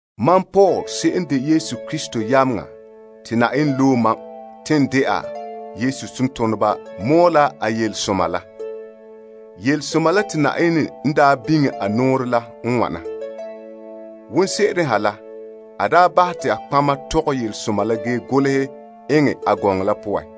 Mam Paul se'em n de Yesu Krista yameŋa te Yenɛ loe mam te n de'a Yesu tontoneba mɔɔla a yelesoma la. Yelesoma la te Yenɛ n daa biŋe a nɔɔrɛ la n wana: wonse'ere ha la a daa bahɛ te a nɔtɔgɔheba la tɔgɛ yelesoma la ge golehɛ eŋɛ a gɔŋɔ la poan.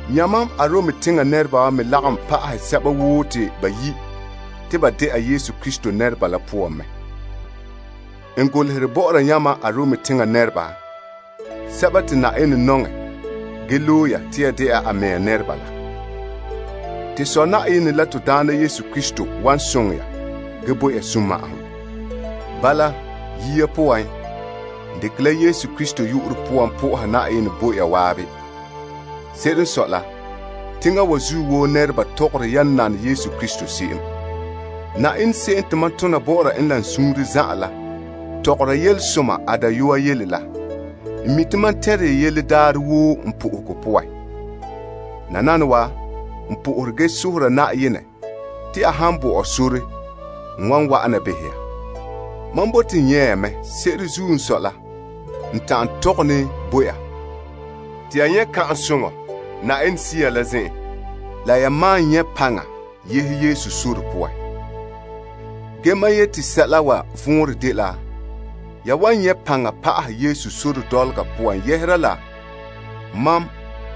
Yamam Arom teŋa nɛreba me lagom pa'ahɛ sɛba woo te bayi' te ba de'a Yesu Krista nɛreba la poan mɛ. N golehere bɔ'ɔra yamam Arom teŋa nɛreba, sɛba te Yenɛ nɔŋɛ ge loe ya te ya de'a a mea nɛreba la. To Sɔ' Yenɛ la to Daana Yesu Krista wan soŋɛ ya ge bo ya sunma'ahom. Bala, yia poan, n dekɛ la Yesu Krista yu'urɛ poan po'ohɛ Yenɛ bo ya waabe. Se'ere n sɔe la, teŋa wa zuo woo nɛreba tɔgɔre yan nane Yesu Krista se'em. Yenɛ se'em te mam tona bɔ'ɔra en la n suunre zan'an la tɔgɔre yelesoma a dayɔa yele la, n mi' te mam tɛnre ya yele daarɛ woo n po'ohegɔ poan. Nananawa, n po'ohere ge sohora Yenɛ te a han bo ɔ sore, n wan wa'ana behɛ ya. Mam bote n nyɛ' ya mɛ se'ere zuo n sɔe la n ta'an tɔgɛ ne bo ya. Te ya nyɛ' Yenɛ Sea som la zen'en la ya malom nyɛ' paŋa ya sakerɛ la poan. Ge mam yeti sɛla wa vɔnrɛ dela ya wan nyɛ' paŋa pa'ahɛ ya sakerɛ la poan yɛhera la mam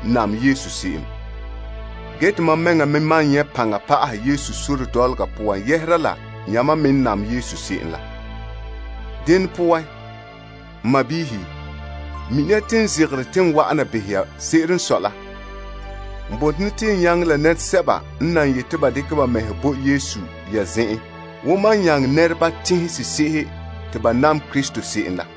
nam se'em. Ge te mam mɛŋa me wan nyɛ' paŋa pa'ahɛ n sakerɛ la poan yɛhera la yamam me n nam se'em la. Dene poan, n sɔɔnrɔ, mini ya te n ne zegera te n wa'ana behɛ ya ge n zege koŋɛ mɛ. N bote ne te n nyaŋɛ la nɛresɛba n nan yeti ba dekɛ ba mɛhe bo Yesu ya zen'en wo mam nyaŋɛ nɛreba teŋhe sese'ehe te ba nam Krista se'em la,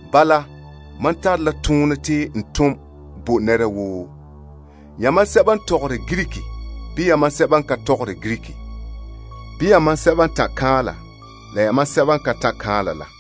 Bala, mam tare la toonɛ te n tom bo nɛra woo, yamam sɛba n tɔgɔrɛ Greek bii yamam sɛba n ka tɔgɔrɛ Greek bii yamam sɛba n ta'an kan'anla, la yamam sɛba n ka ta'an kan'anla la.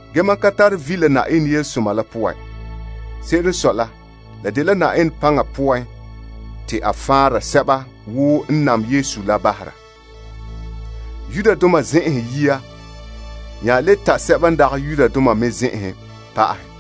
Ge mam ka tare vi' la Yenɛ yelesoma la poan. Se'ere n sɔe la, la dela Yenɛ paŋa poan te a faanra sɛba woo n nam Yesu la bahera. Yudoma zen'enhen yia nya le ta' sɛba n dagɛ Yudoma me zen'enhen pa'ahɛ.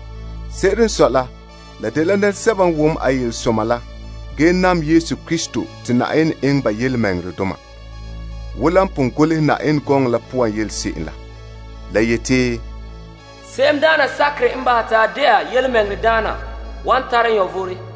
Se'ere n sɔe la la dela nɛresɛba n wom a yelesoma la gee nam Krista te Yenɛ eŋɛ ba yelemɛŋɛrɛdoma. Wo la pon golehɛ Yenɛ gɔŋɔ poan yele se'em la. La yeti, Se'emdaana sakerɛ n bahɛ te a de'a yelemɛŋɛrɛdaana wan tara vom.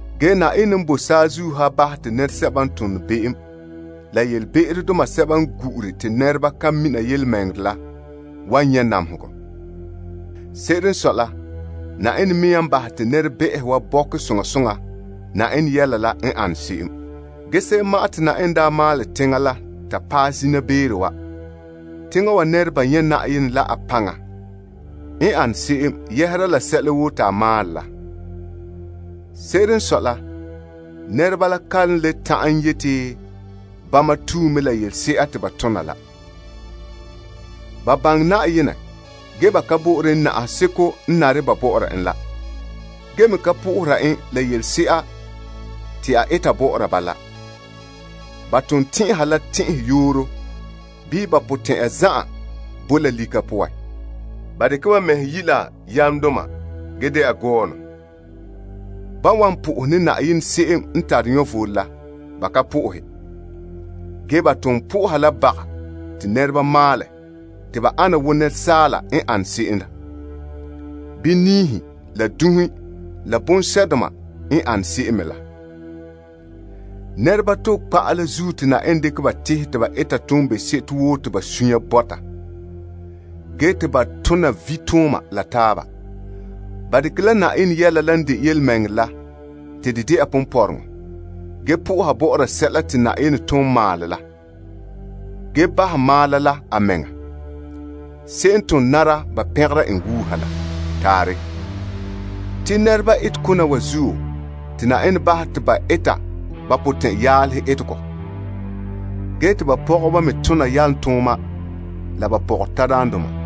Ge Yenɛ n boe saazuo ha wan bahɛ te be'emdoma sɛba n gu'ure te nɛra ka mina yelemɛŋɛrɛ la wan nyɛ' namehegɔ. Se'ere n sɔe la Yenɛ mea n bahɛ te nɛrebɛ'ɛhe wa bɔkɛ soŋa soŋa Yenɛ Yɛla la n an se'em. Ge se'em ma'an te Yenɛ n daa maalɛ teŋa la ta paɛ zina beere wa, teŋa wa nɛreba nyɛ' Yenɛ la a paŋa n an se'em yɛhera la sɛla woo te a maalɛ la. Se'ere n sɔe la nɛreba la kan le ta'an yeti bama tue mɛ la yelese'a te ba tona la. Ba baŋɛ Yenɛ ge ba ka bo'ore en na'ahegɔ seko n nare ba bɔ'ɔra en la. Ge me ka po'ohera en la yelese'a te a eta bɔ'ɔra ba la. Ba ton tɛn'ɛha la tɛn'ɛyooro bii ba potɛn'ya zan'an boe la lika poan. Ba dekɛ ba mɛhe yi' la yamdoma ge de'a gɔɔnɔ. Ba ka po'ohere Yenɛ se'em n tare vom la. Ge ba ton kaanbera la baga te nɛreba maalɛ te ba ana wo nɛresaala, n ane se'em bii niihe la dunhe la bonsɛ'doma n ane se'em me la. Te nɛreba toba kpa'a la zuo te Yenɛ dekɛ ba tehɛ te ba eta toonbe'sebo woo te ba sunya bɔta, ge te ba tona vitooma la taaba. Ba dekɛ la Yenɛ Yɛla la n de yelemɛŋɛrɛ la te de de'a ponpɔrɔŋɔ. Ge po'oha bɔ'ɔra sɛla te Yenɛ ton maalɛ la, ge bahɛ maala la a mɛŋa, se'em n ton nara ba pɛngera en wuuha la! Taarɛ. Te nɛreba etekona wa zuo, te Yenɛ bahɛ ba te ba eta ba potɛn'yaalehe etegɔ. Ge te ba pɔgɔba me tona yalomtooma la ba pɔgɔtadaandoma.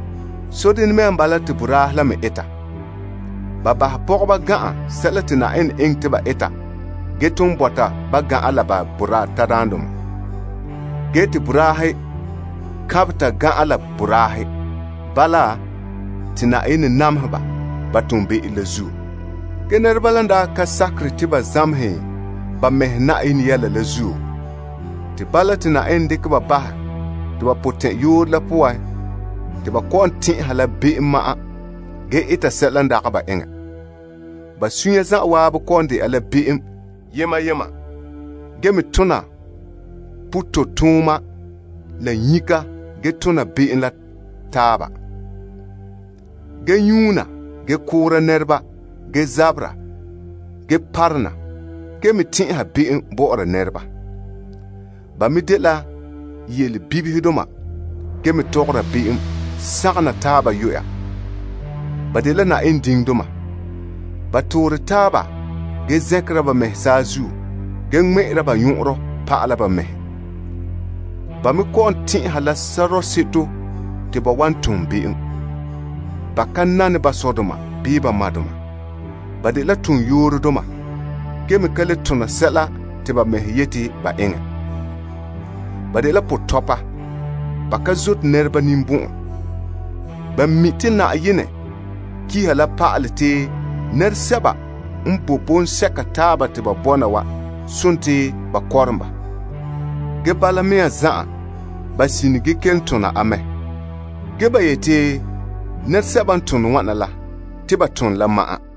Sodene mea n bala te boraahe la me eta. Ba bahɛ pɔgɔhe gan'an sɛla te Yenɛ eŋɛ te ba eta ge ton bɔta ba gan'an la ba boraa tadaandoma. Ge te boraahe kaanbɛ ta gan'an la boraahe. Bala, te Yenɛ nameha ba ba toonbe'ero la zuo. Ge nɛreba la n daa ka sakere te ba zamehɛ ba mɛhe Yenɛ Yɛla la zuo, te bala te Yenɛ dekɛ ba bahɛ te ba potɛn'yooro la poan te ba kɔ'ɔn tɛn'ɛha la be'em ma'an ge eta sɛla n dagɛ ba eŋɛ. Ba sunya zanwaabe kɔ'ɔn de'a la be'em yema yema. Ge me tona pototooma la nyika ge tona be'em la taaba, ge nyuuna ge koora nɛreba ge zabera ge parona ge me tɛn'ɛha be'em bɔ'ɔra nɛreba. Ba me dela yelebibihedoma ge me tɔgɔra be'em sagom na taaba yuya. Ba dela Yenɛ diŋdoma. Ba toore taaba ge zɛnkera ba mɛhe saazuo ge ŋmɛ'ɛra ba nyɔn'ɔnrɔ pa'ala ba mɛhe. Ba me kɔ'ɔn tɛn'ɛha la sɔrɔɔ seto te ba wan tom be'em. Ba ka nane ba sɔdoma bii ba madoma. Ba dela toonyoorodoma, ge me ka le tona sɛla te ba mɛhe yeti ba eŋɛ. Ba dela potɔpa. Ba ka zote nɛreba ninbɔn'ɔn. Ba me mi' te Yenɛ kiha la pa'alɛ te nɛresɛba n boe bɔŋsɛka taaba te ba bɔna wa sontii ba kɔrom ba. Ge bala mea zan'an ba sine ge kelom tona a mɛ. Ge ba yeti, nɛresɛba n tone wana wa la, te ba tone la ma'an.